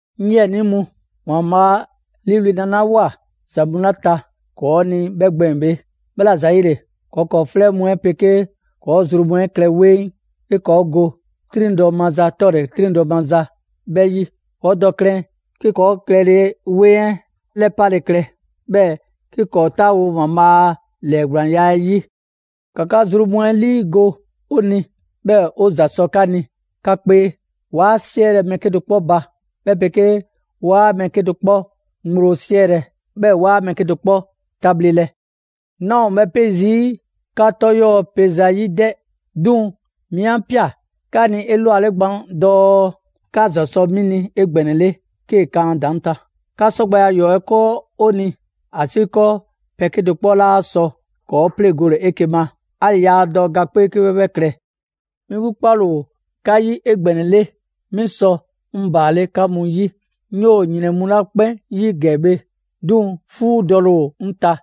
'Ŋ 'yiɛnii mu, ‑Waanbhaa' 'a 'liiwli‑ nalawoa ‑za mu 'la ta ‑kɔɔ' ni 'bhɛ gbɛɛn‑ bhe, 'bhɛla‑ ‑zayile, ‑kɔɔ' ‑kɔɔ' 'flɛ mu 'ɛ 'pegee ‑kɔɔ' zru mu 'ɛ klɛ 'weŋ 'ke ‑kɔɔ' go 'triŋdɔ‑ maza 'tɔle‑ 'triŋdɔ‑ maza 'bhɛ 'yi. ‑Kɔɔ' dɔ klɛn 'ke ‑kɔɔ' klɛle 'weŋ 'ɛ 'lɛpale klɛ, 'bhɛɛ‑ 'ke ‑kɔɔ' 'taawo‑ ‑Waanbhaa' a ‑lɛɛgblaanya 'ɛ 'yi. ‑Ka 'ka zru mu 'ɛ 'liigo‑ 'o ni, 'bhɛɛ‑ 'o ‑za 'sɔ 'ka ni 'ka 'kpee! 'Waa 'siɛlɛ‑ mɛɛ 'kedo‑ 'kpɔ ba, 'bhɛ 'pegee 'waa mɛɛ kedo‑ 'kpɔ ŋgblo 'siɛlɛ‑, 'bhɛɛ‑ 'waa mɛɛ 'kedo‑ 'kpɔ tabhlelɛ. 'Naa ‑o 'bhɛ 'pe zii' 'ka 'tɔ 'yɔɔ‑ pe zayi' 'dɛ, 'duŋ‑ 'mi 'a ꞊pia 'ka ni 'elwale gban dɔɔ 'ka ‑za sɔ 'mi ni 'egbɛnɛle 'kee‑ kan ‑a ‑daŋ' ta. 'Ka 'sɔgbɛya ‑yɔɔ' 'ɛ 'kɔɔ 'o ni, ‑asiikɔɔ pɛ 'kedo‑ 'kpɔ 'laa sɔ ‑kɔɔ' 'pleŋgole 'eke‑ ma; 'ali‑ yaa dɔ ga 'kpee 'ke 'bhɛ 'bhɛ klɛ. 'Mi 'gbu 'kpale‑ ‑o 'ka 'yi 'egbɛnɛle, 'mi sɔ 'ŋ ‑baale' 'ka mu 'yi. 'Ŋ 'yoo‑ ‑yrɛn mu 'la 'kpɛn 'yi ‑gɛ bhe, 'duŋ‑ 'fuudɔle ‑o 'ŋ ta,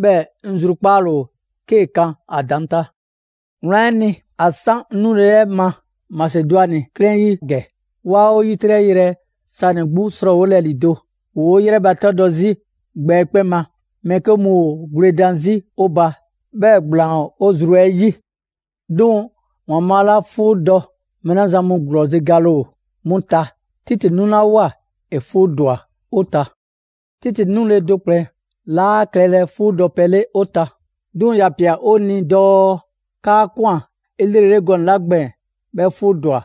'bhɛɛ‑ 'ŋ zrukpaale ‑o 'kee‑ kan ‑a ‑daŋ' ta. Wlan 'ɛ ni, ‑a 'san 'ŋ nule 'ɛ ma Masedwani ‑wa 'ɛ ta ‑gɛ, 'waa 'o 'yitrɛ‑ yrɛ sanɛ‑ 'gbu 'srɔɔwolɛ ‑lido'. ‑Woo' 'yrɛbatɛdɔ 'zi gbɛ 'ɛ 'kpɛn ma. Mɛɛ 'ke mu ‑o gwledan 'zi 'o ba, 'bhɛɛ‑ ‑gblaan ‑o 'o zru 'yi. 'Duŋ‑ ‑Waanbhaa' 'la 'fuudɔ‑ mɛɛ 'la zan mu ‑gblɔzi' gale ‑o 'mu ta, Titi 'nulawoa, ‑e 'fuudwa‑ 'o ta. Titi 'nule‑ do ‑kplɛn 'laa klɛlɛ 'fuudɔpɛ 'le 'o ta. 'Duŋ‑ ‑ya ꞊pia 'o ni dɔɔ 'kaa‑ ꞊kwan 'elrele gɔnɛ‑ 'la gbɛɛn‑ 'bhɛ 'fuudwa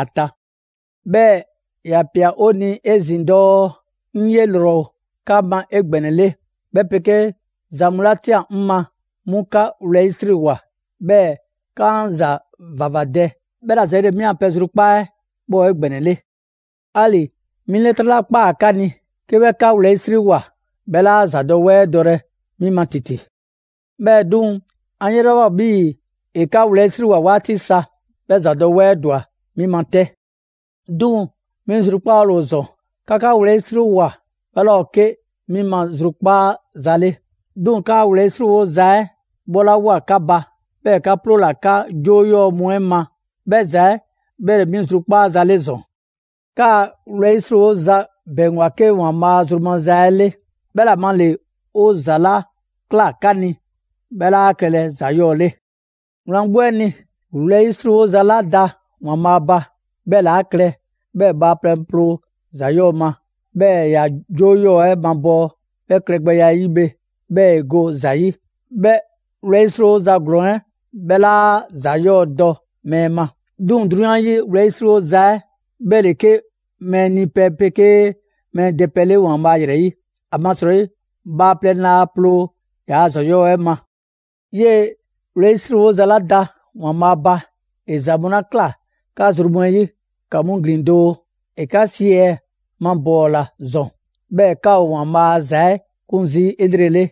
‑a ta. 'Bhɛɛ‑ ‑ya ꞊pia 'o ni 'ezin‑ dɔɔ 'ŋ 'ye ‑lrɔ ‑o 'ka ma 'egbɛnɛle, 'bhɛ 'pegee ‑za mu 'la ꞊tian 'ŋ ma, 'mu 'ka wlɛyisriwoa, 'bhɛɛ‑ 'ka 'an ‑za ‑vavadɛ. 'Bhɛla‑ ‑zayile 'mi a pɛ zrukpaa' 'bhɛ ‑o 'egbɛnɛle. 'Ali‑ 'mi 'lɛtrɛ 'la ꞊kpaa 'ka ni, 'ke 'bhɛ 'ka wlɛyisriwoa, 'bhɛ 'laa ‑zadɔwɛɛ dɔlɛ 'mi ma ‑titi. 'Bhɛɛ‑ 'duŋ‑, 'an 'yelawoa 'bhii‑ ‑e 'ka wlɛyisriwoa 'waati sa, 'bhɛɛ‑ ‑zadɔwɛɛ ‑dwa 'mi ma 'tɛ. 'Duŋ‑, 'mi zrukpaale ‑o ‑zɔn. 'Ka 'ka wlɛyisrilawoa 'bhɛ 'laa ‑o 'ke 'mi zrukpaaza 'le. 'Duŋ‑ 'kaa‑ wlɛyisriwoza 'ɛ 'bhɔlawoa 'ka ba, 'bhɛɛ‑ 'ka 'ploola‑ 'ka 'joo 'yɔɔ‑ mu 'ɛ ma, 'bhɛ ‑za 'ɛ 'bhɛ ‑le 'mi zrukpaaza 'le ‑zɔn. 'Kaa‑ wlɛyisriwoza ‑bɛŋgwa 'ke ‑Waanbhaa' zru maza 'ɛ 'le; 'bhɛ ‑la ma ‑le 'o ‑za 'la ꞊kla 'ka ni, 'bhɛ 'laa klɛlɛ ‑za 'yɔɔ‑ 'le. Wlan 'gbu 'ɛ ni, wlɛyisriwoza 'la da ‑Waanbhaa' ba, 'bhɛ ‑le 'a klɛ 'bhɛɛ‑ bhaaplɛŋ ploo ‑za 'yɔɔ‑ ma, 'bhɛɛ‑ ‑ya 'joo 'ɛ mabɔɔ; 'bhɛ klɛgbɛya 'ɛ 'yi bhe, 'bhɛɛ‑ ‑e go ‑za 'yi. 'Bhɛ wlɛyisriwoza ‑glɔɔn 'ɛ 'bhɛ 'laa ‑zadɔwɛɛ dɔ mɛɛ ma. 'Duŋ‑, 'drunyan 'yi wlɛyisriwoza 'ɛ, 'bhɛ ‑le 'ke mɛɛ nipɛ 'pegee mɛɛ dɛpɛ 'le ‑Waanbhaa' ‑yrɛ 'yi, ‑amasrɔyi bhaaplɛŋ laa ploo ‑yaa' ‑za 'yɔɔ‑ 'ɛ ma. 'Yee‑ wlɛyisriwoza 'la da ‑Waanbhaa' ba ‑e ‑za mu 'la ꞊kla 'ka zru mu 'ɛ 'yi ‑ka 'mu ‑glin doo! ‑E 'ka ꞊si 'ɛ mabɔɔla ‑zɔn, 'bhɛɛ‑ 'ka ‑o ‑Waanbhaa' a ‑za 'ɛ 'kun zii' 'elrele;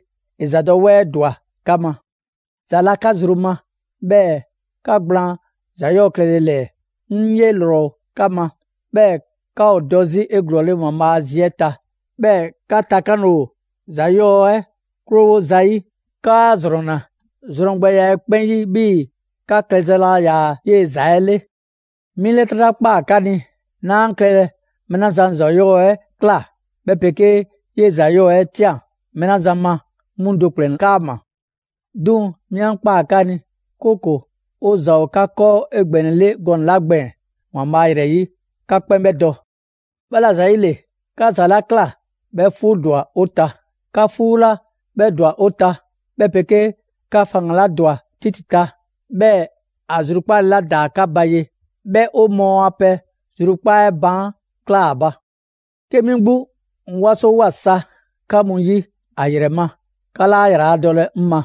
‑e ‑zadɔwɛɛ ‑dwa 'ka ma. ‑Za la 'ka zru ma; 'bhɛɛ‑ 'ka gblaan ‑za 'yɔɔ‑ klɛle ‑lɛɛ. 'Ŋ 'ye ‑lrɔ ‑o 'ka ma, 'bhɛɛ‑ 'ka ‑o dɔ 'zi 'eglɔɔle ‑Waanbhaa' a zi 'ɛ ta. 'Bhɛɛ‑ 'ka takanle ‑o ‑za 'yɔɔ‑ 'ɛ 'krowo zayi'. 'Kaa ‑zrɔnna zrɔngbɛya 'ɛ 'kpɛn 'yi 'bhii‑ 'ka klɛza laa ‑yaa 'yee‑ ‑za 'ɛ 'le. 'Mi 'lɛtrɛ 'la ꞊kpaa 'ka ni, 'naa klɛlɛ mɛɛ 'la zan ‑za 'yɔɔ‑ 'ɛ ꞊kla, 'bhɛ 'pegee 'yee‑ ‑za 'yɔɔ‑ 'ɛ ꞊tian mɛɛ 'la zan ma, 'mu do ‑kplɛn 'kaama‑. 'Duŋ‑, 'mi 'a ꞊kpaa 'ka ni, 'kooko‑ 'o ‑za ‑o 'ka 'kɔɔ 'egbɛnɛle gɔnɛ‑ 'la gbɛɛn‑ ‑Waanbhaa' ‑yrɛ 'yi, 'ka 'kpɛn 'bhɛ dɔ. 'Bhɛla‑ ‑zayile, 'ka ‑za 'la ꞊kla 'bhɛ 'fuudwa‑ 'o ta. 'Ka 'fuu la 'bhɛ ‑dwa 'o ta, 'bhɛ 'pegee 'ka faŋgan‑ 'la ‑dwa Titi ta, 'bhɛɛ‑ ‑a zrukpaale 'la ‑daa 'ka ba ye, 'bhɛ 'o mɔɔ a pɛ zrukpaa' 'ɛ baan' ꞊klaa ‑a ba. 'Ke 'mi 'gbu 'ŋ 'wasowoa sa 'ka mu 'yi ‑a ‑yrɛ ma, 'ka 'laa ‑yraladɔlɛ 'ŋ ma.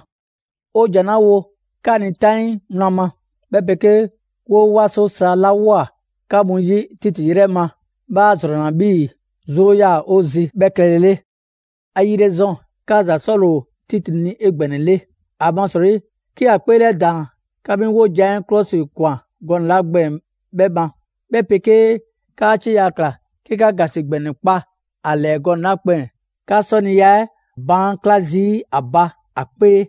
'O ‑jan 'la wo 'ka ni 'taŋii wlan ma, 'bhɛ 'pegee 'woo 'waso sa 'la ꞊woa 'ka mu 'yi Titi 'yrɛ ma, 'bhɛ 'a ‑zrɔnna 'bhii‑ 'zoo 'yaa‑ 'o zi 'bhɛ klɛlele. ‑Ayile ‑zɔn, 'ka za 'sɔle‑ ‑o Titi ni 'egbɛnɛle; ‑amasrɔyi 'ke ‑ya 'kpeelɛdaan 'ka mi 'wojan‑ 'ɛ 'klɔsikwan gɔnɛ‑ 'la gbɛɛn‑ 'bhɛ ma, 'bhɛ 'pegee 'kaa 'cieya‑ ꞊kla 'ke 'ka ‑gasi ‑gbɛnɛ kpa a ‑lɛɛ gɔnɛ‑ 'la gbɛɛn‑, 'ka 'sɔniya 'ɛ baan' 'kla zii' ‑a ba ‑a 'kpee.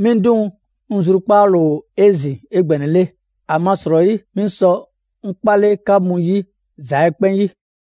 'Mi 'duŋ‑, 'ŋ zrukpaale ‑o 'ezin‑ 'egbɛnɛle, ‑amasrɔyi 'mi sɔ 'ŋ 'kpale‑ 'ka mu 'yi ‑za 'ɛ 'kpɛn 'yi.